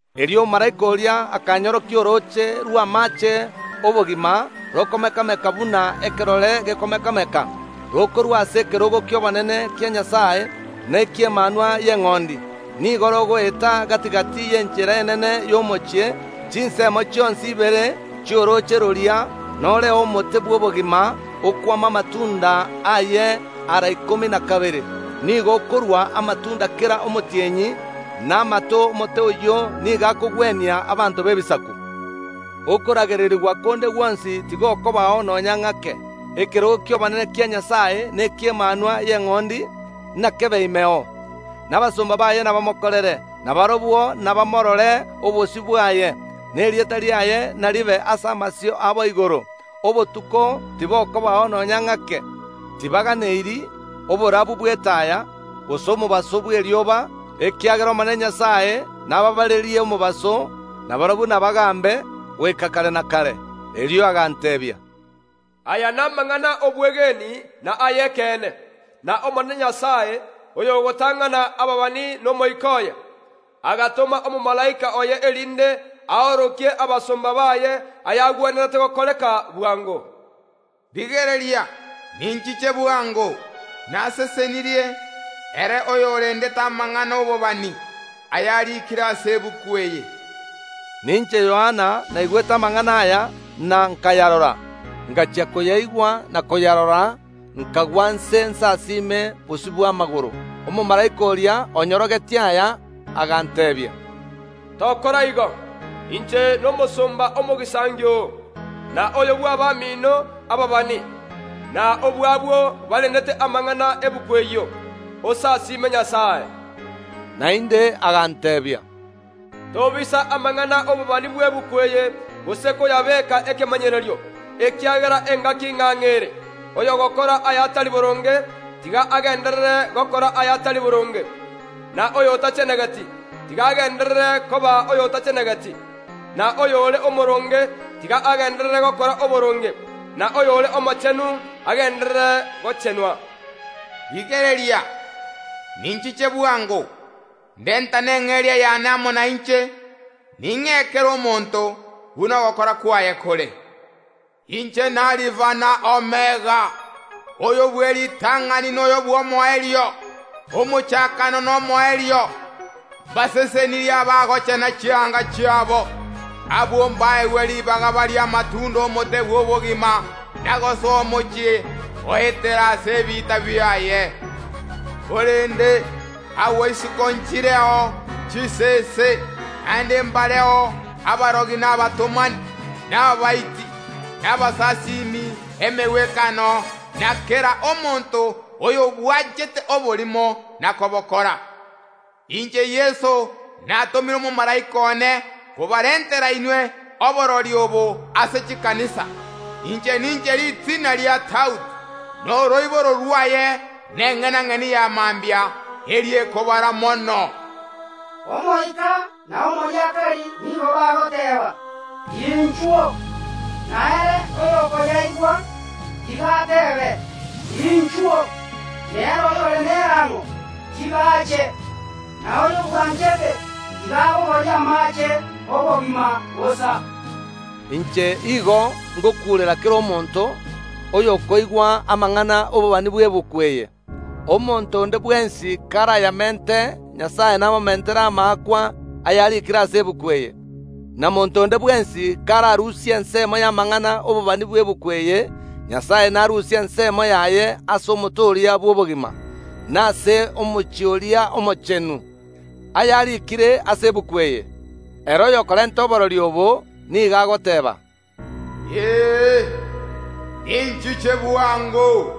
Erio omomalaika oria akanyorokia orooche rw’amaache ’obogima rokomeka‐meka buna ekerore gekomeka‐meka, rokorua ase ekerogo ki’obonene kia Nyasae na eki’Emanwa y’Eng’ondi, nigo rogoeta gati‐gati y’enchera enene y’omochie. Chinsemo chionsi ibere chi’orooche roria noreo omote bw’obogima, okwama amatunda aye ara ikomi na kabere; nigo okorua amatunda kera omotienyi, na amato ’omote oyio nigo akogwenia abanto b’ebisaku. Okoragererigwa konde gwonsi tigokobao nonya ng’ake. Ekerogo ki’obonene kia Nyasae neki’Emanwa y’Eng’ondi nakebe imeo, na abasomba baye nabamokorere. Na barabwo nabamorore obosio bwaye, na erieta riaye naribe ase amasio abo igoro. Obotuko tibokobao nonya ng’ake, tibaganeiri oborabu bw’etaya gose omobaso bw’erioba, ekiagera Omonene nabaabarerie omobaso, na barabwo nabagambe goika kare na kare. Erio aganteebia, “Aya namang’ana ’obwegeni na ay’ekeene, n’Omonene Nyasae, oyogotang’ana ababani n’Omoika oye, agatoma omomalaika oye, erinde aorokerie abasomba baye ayagwenerete gokoreka bwango. Rigereria, ninchiche bwango.” Nasesenirie ere oyorendete amang’ana ’obobani, ayarikire ase egetabu eke. Ninche Yohana naigwete amang’ana aya na nkayarora. Ngachia koyaigwa na koyarora nkagwa inse nsasime bosio bw’amagoro ’omomalaika oria onyorogetie aya. Aganteebia, “Tokora igo! Inche nomosomba omogisangio oo, na oyo bw’abamino ababani, na obw’abwo barendete amang’ana ’egetabu ekio. Osasime Nyasae.” Naende aganteebia, “Tobisa amang’ana ’obobani bw’egetabu eke gose koyabeka ekemanyererio, ekiagera engaki ng’ang’e ere Oyogokora ayatari boronge, tiga agenderere gokora ayatari boronge, na oyotachenegeti, tiga agenderere koba oyotachenegeti, na oyore omoroonge, tiga agenderere gokora oboronge, na oyore omochenu agenderere gochenwa.” “Rigereria, ninchiche bwango, ndetane eng’eria yane amo nainche, ning’ee kera omonto buna ogokora kwaye kore. Inche n’Alifa na Omega, Oyo bw’eritang’ani na Oyo bw’Omoerio, Omochakano na Omoerio.” Mbasesenirie abagochena chianga chiabo! Abwo mbaegwe ribaga barie amatunda ’omote bw’obogima na gosoa omochie goetera ase ebiita biaye. Korende agwo isiko nchireo chisese, naende mbareo abarogi, na abatomani, na abaiti, na abasasimi emegwekano na kera omonto oyobwanchete oborimo na kobokora. “Inche Yeso natomire omomalaika one kobarentera inwe oborori obo ase chikanisa. Inche ninche Ritina ria Daudi, na Oroiboro rwaye, na Eng’enang’eni ya Mambia, eria ekobara mono.” Omoika na omoriakari nigo bagoteeba, “Inchuo!” Na ere oyokoyaigwa, tiga ateebe, “Inchuo!” Na ere oyore nerang’o, tiga ache, na oyobwanchete, tiga abogorie amaache ’obogima bosa. Inche igo ng okuurera kera omonto oyokoigwa amang’ana ’obobani bw’egetabu eke: Omonto onde bwensi karayamente, Nyasae namomentere amaakwa ayarikire ase egetabu eke; na monto onde bwensi kararusie ensemo y’amang’ana ’obobani bw’egetabu eke, Nyasae narusie ensemo yaye ase omote oria bw’obogima, na ase omochie oria omochenu, ayarikire ase egetabu eke. Ere oyokorenta oborori obo, nigo agoteeba, “Ee, ninchiche bwango!”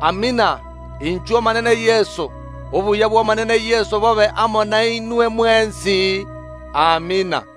Amina. Inchu Omonene Yeso! Obuya bw’Omonene Yeso bobe amo nainwe mwensi. Amina.